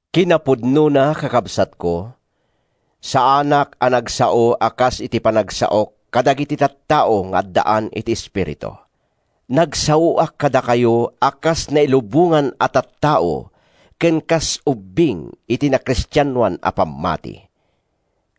Kinapudnona, kakabsatko, saanak a nagsao a kas iti panagsaok kadagiti tattao nga addaan iti Espiritu. Nagsaoak kadakayo a kas nailubongan a tattao ken kas ubbing iti nakristianoan a pammati.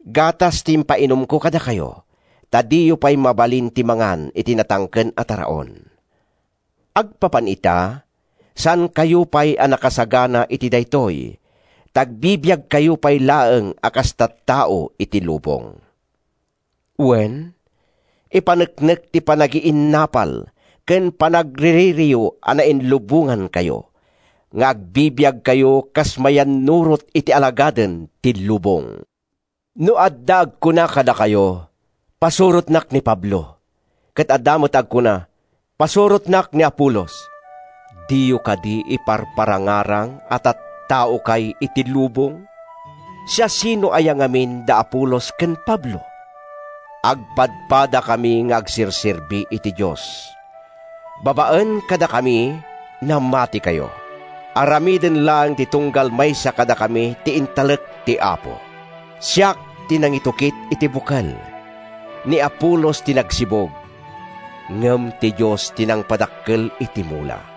Gatas ti impainumko kadakayo, ta diyo pay mabalin ti mangan iti natangken a taraon. Agpapan ita, saankayo pay a nakasagana iti daytoy ta agbibiagkayo pay laeng a kas tattao iti lubong. Wen, ipaneknek ti panagiinnapal ken panagriririyo a nainlubongankayo, nga agbibiagkayo kas mayannurot iti alagaden ti lubong. No adda agkuna kadakayo, “Pasurotnak ni Pablo,” ket adda met agkuna, “Pasurotnak ni Apolos,” diyo kadi iparparangarang a tattaokay iti lubong? Siasino aya ngamin da Apolos ken Pablo? Agpadpadakami nga agserserbi iti Dios. Babaen kadakami, namatikayo. Aramiden laeng ti tunggal maysa kadakami ti intalek ti Apo. Siak ti nangitukit iti bukel. Ni Apolos ti nagsibug. Ngem ti Dios ti nangpadakkel iti mula.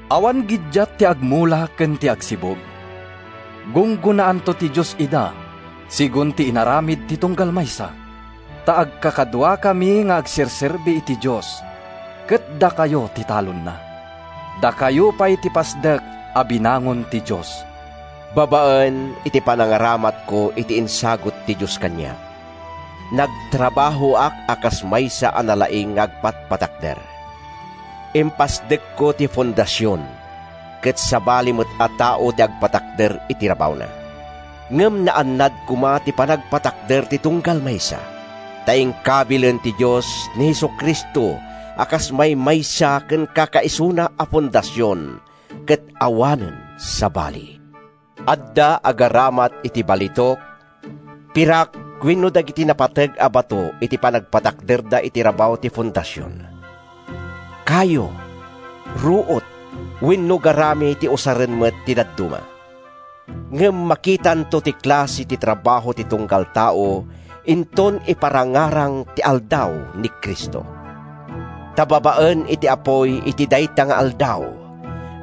Awan giddiat ti agmula ken ti agsibug. Gunggonaanto ti Dios ida segun ti inaramid ti tunggal maysa. Ta agkakaduakami nga agserserbi iti Dios, ket dakayo ti talonna. Dakayo pay ti pasdek a binangon ti Dios. Babaen iti panangaramatko iti insagut ti Dios kaniak, nagtrabahoak a kas maysa a nalaing nga agpatpatakder. Impasdekko ti fondasion, ket sabali met a tao ti agpatakder iti rabawna. Ngem naannad koma ti panagpatakder ti tunggal maysa. Ta inkabilen ti Dios ni Jesu-Cristo a kas maymaysa ken kakaisuna a fondasion, ket awanen sabali. Adda agaramat iti balitok, pirak wenno dagiti napateg a bato iti panagpatakderda iti rabaw ti fondasion. Kayo, ruot wenno garami ti usaren met ti dadduma. Ngem makitanto ti klase ti trabaho ti tunggal tao inton iparangarang ti Aldaw ni Cristo. Ta babaen iti apuy iti dayta nga aldaw,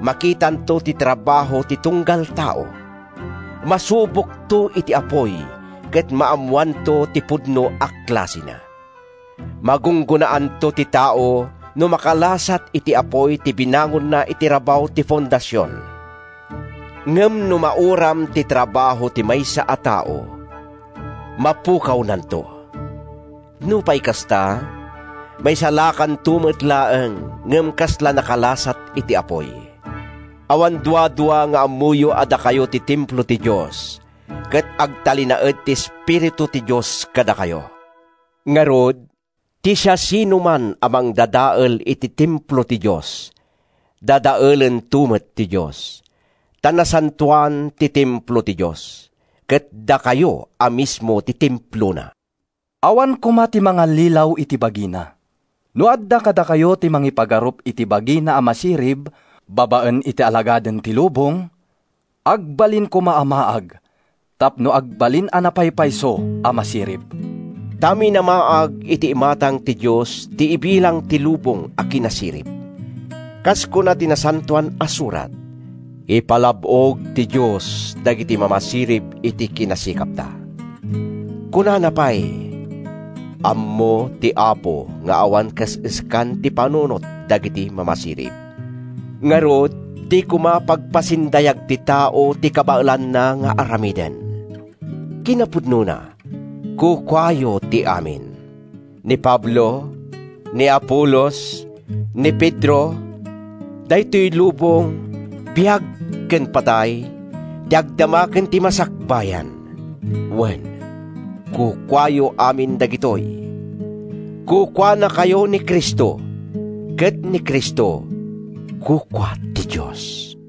makitanto ti trabaho ti tunggal tao; masubokto iti apuy ket maammoanto ti pudno a klasena. Magunggonaanto ti tao no makalasat iti apuy ti binangonna iti rabaw ti fondasion. Ngem no mauram ti trabaho ti maysa a tao, mapukawnanto. Nupay kasta, maisalakanto met laeng ngem kasla nakalasat iti apuy. Awan duadua nga ammoyo a dakayo ti templo ti Dios, ket agtalinaed ti Espiritu ti Dios kadakayo. Ngarud, ti siasinoman a mangdadael iti templo ti Dios, dadaelento met ti Dios. Ta nasantoan ti templo ti Dios, ket dakayo a mismo ti templona. Awan koma ti mangallilaw iti bagina. No adda kadakayo ti mangipagarup iti bagina a masirib, babaen iti alagaden ti lubong, agbalin koma a maag tapno agbalin a napaypayso a masirib. Ta minamaag iti imatang ti Dios ti ibilang ti lubong a kinasirib. Kas kuna ti Nasantoan a Surat, “Ipalab-og ti Dios dagiti mamasirib iti kinasikapda.” Kunana pay, “Ammo ti Apo nga awan kaes-eskan ti panunot dagiti mamasirib.” Ngarud, di koma pagpasindayag ti tao ti kabaelanna nga aramiden. Kinapudnona, kukuayo ti amin: Ni Pablo, ni Apolos, ni Pedro, daytoy lubong, biag ken patay, ti agdama ken ti masakbayan. Wen, kukuayo amin dagitoy. Kukuanakayo ni Cristo, ket ni Cristo kukua ti Dios.